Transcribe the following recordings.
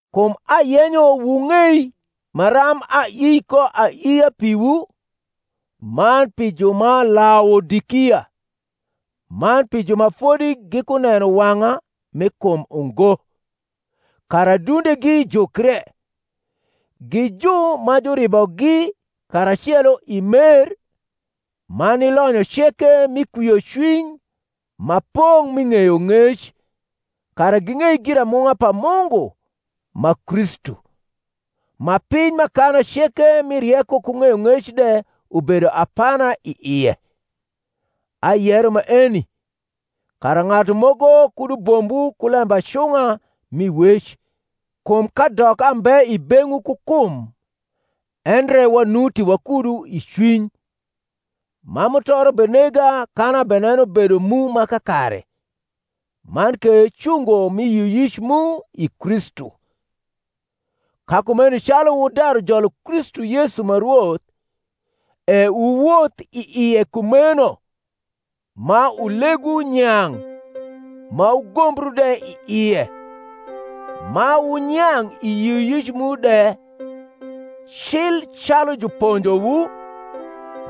Kum ayenyo wung’ei maram aii ko aiia piwu, man pi ju ma Laodikia, man pi ju ma fodi gikuneno wang’a mi kum ungo; kara adundegi jukre, gi ju ma juribogi karacelo i mer, man ni lonyo ceke mi kwiocwiny ma pong’ mi ng’eyong’ec, kara ging’ei giramung’a pa Mungu, ma Kristu, ma piny m’akana ceke mi rieko ku ng’eyong’ec de ubedo apana i ie. Ayero maeni, kara ng’atu moko kud ubombwu ku lembacung’a mi wec. Kum kadok ambe i beng’wu ku kum, endre wanuti wakudu i cwiny, ma mutoro benega kan abeneno bedo mu ma kakare, man ke cungo mi yioyic mu i Kristu. Ka kumeno calu wudaru jolo Kristu Yesu ma Rwoth, e wuwoth i ie kumeno, ma ulegwu nyang’ ma wugombru de i ie, ma wunyang’ i yioyic mu de, cil calu juponjowu,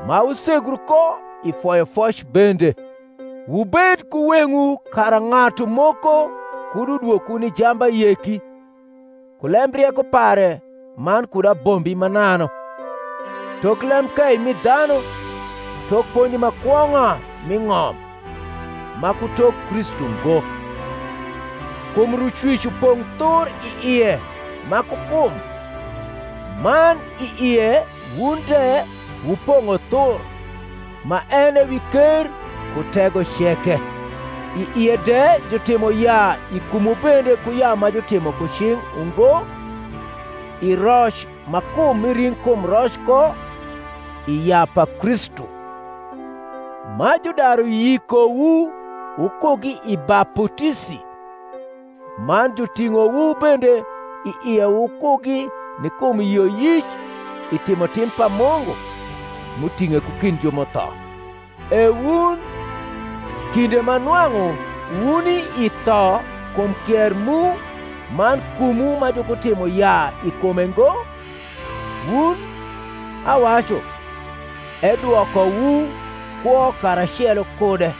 ma wusegru ko i foyofoc bende. Wubed ku weng’wu kara ng’atu moko kud udwokwu ni jambayeki ku lembrieko pare man kud abombi mananu, tok lembkei mi dhanu, tok ponji ma kwong’a m’i ng’om, ma ku tok Kristu ngo: kum Rucwic upong’ thur i ie ma ku kum, man i ie wun de wupong’o thur, ma en e wi ker ku tego ceke: i ie de jutimo yaa i kumwu bende ku yaa ma jutimo ku cing’ ungo, i roc ma kum mi ring’kum roc ko, i yaa pa Kristu; ma judaru yikowu wukugi i baputisi, man juting’owu bende i ie wukugi ni kum yioyic i timotim pa Mungu, m’uting’e ku kind ju m’utho. E wun, kinde ma nwang’u wuni i tho kum kier mu man kumwu ma jukutimo yaa i kume ngo, wun, awacu, edwokowu kwo karacelo kude,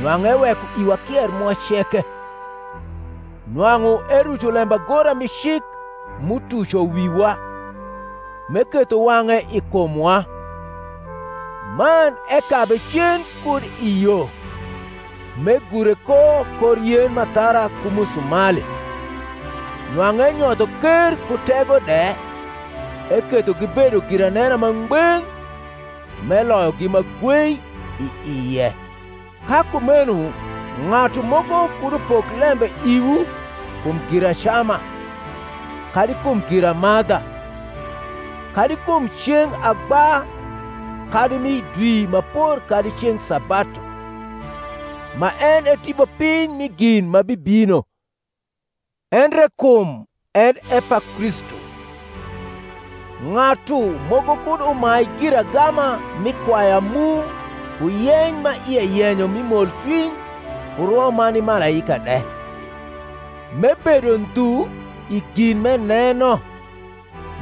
nwang’u eweko iwa kier mwa ceke; nwang’u eruco lembagora mi cik m’utuco wiwa, m’eketho wang’e i kumwa: man ekabe cen kud i yo, m’egure ko kor yen m’athara ku musumali; nwang’u enyotho ker ku tego de, eketho gibedo giranena ma ngbeng’, m’eloyogi ma gwei i ie. Ka kumeno ng’atu moko kud upok lembe iwu kum giracama, kadi kum giramadha, kadi kum ceng’ agba kadi mi dwi ma por kadi ceng’ sabatu; ma en e tipopiny mi gin ma bibino; endre kum en e pa Kristu. Ng’atu moko kud umai giragama mi kwaya mu ku yeny ma ie yenyo mi molcwiny ku rwo ma ni malaika de, m’ebedo ndhu i gin m’eneno,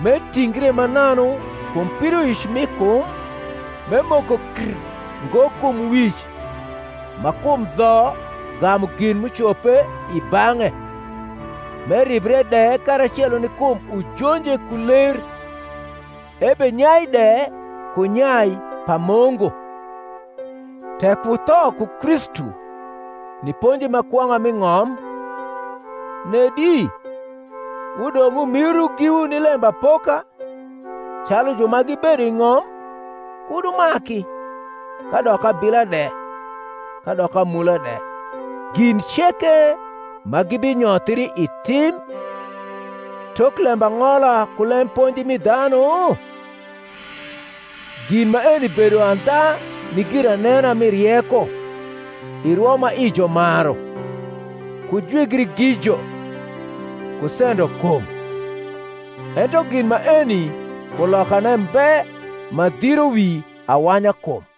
m’etingre mananu kum pidoic mi kum, m’emoko kr ngo kum Wic ma kum dho gamu gin m’ucope i bang’e, m’eribre de karacelo ni kum ujonje ku ler, ebenyai de ku nyai pa Mungu. Tek wutho ku Kristu ni ponji ma kwong’a m’i ng’om, nedi, wudong’ wumiru giwu ni lembapoka, calu ju ma gibedo i ng’om, Kud wumaki, kadok abila de, kadok amula de (gin ceke ma gibinyothri i tim), tok lembang’ola ku lemponji mi dhanu? Gin maeni bedo andha ni giranena mi rieko i rwo ma ijo maru, ku jwigri gijo, ku sendo kum: ento gin maeni kulokane mbe ma dhiro wi awanyakum.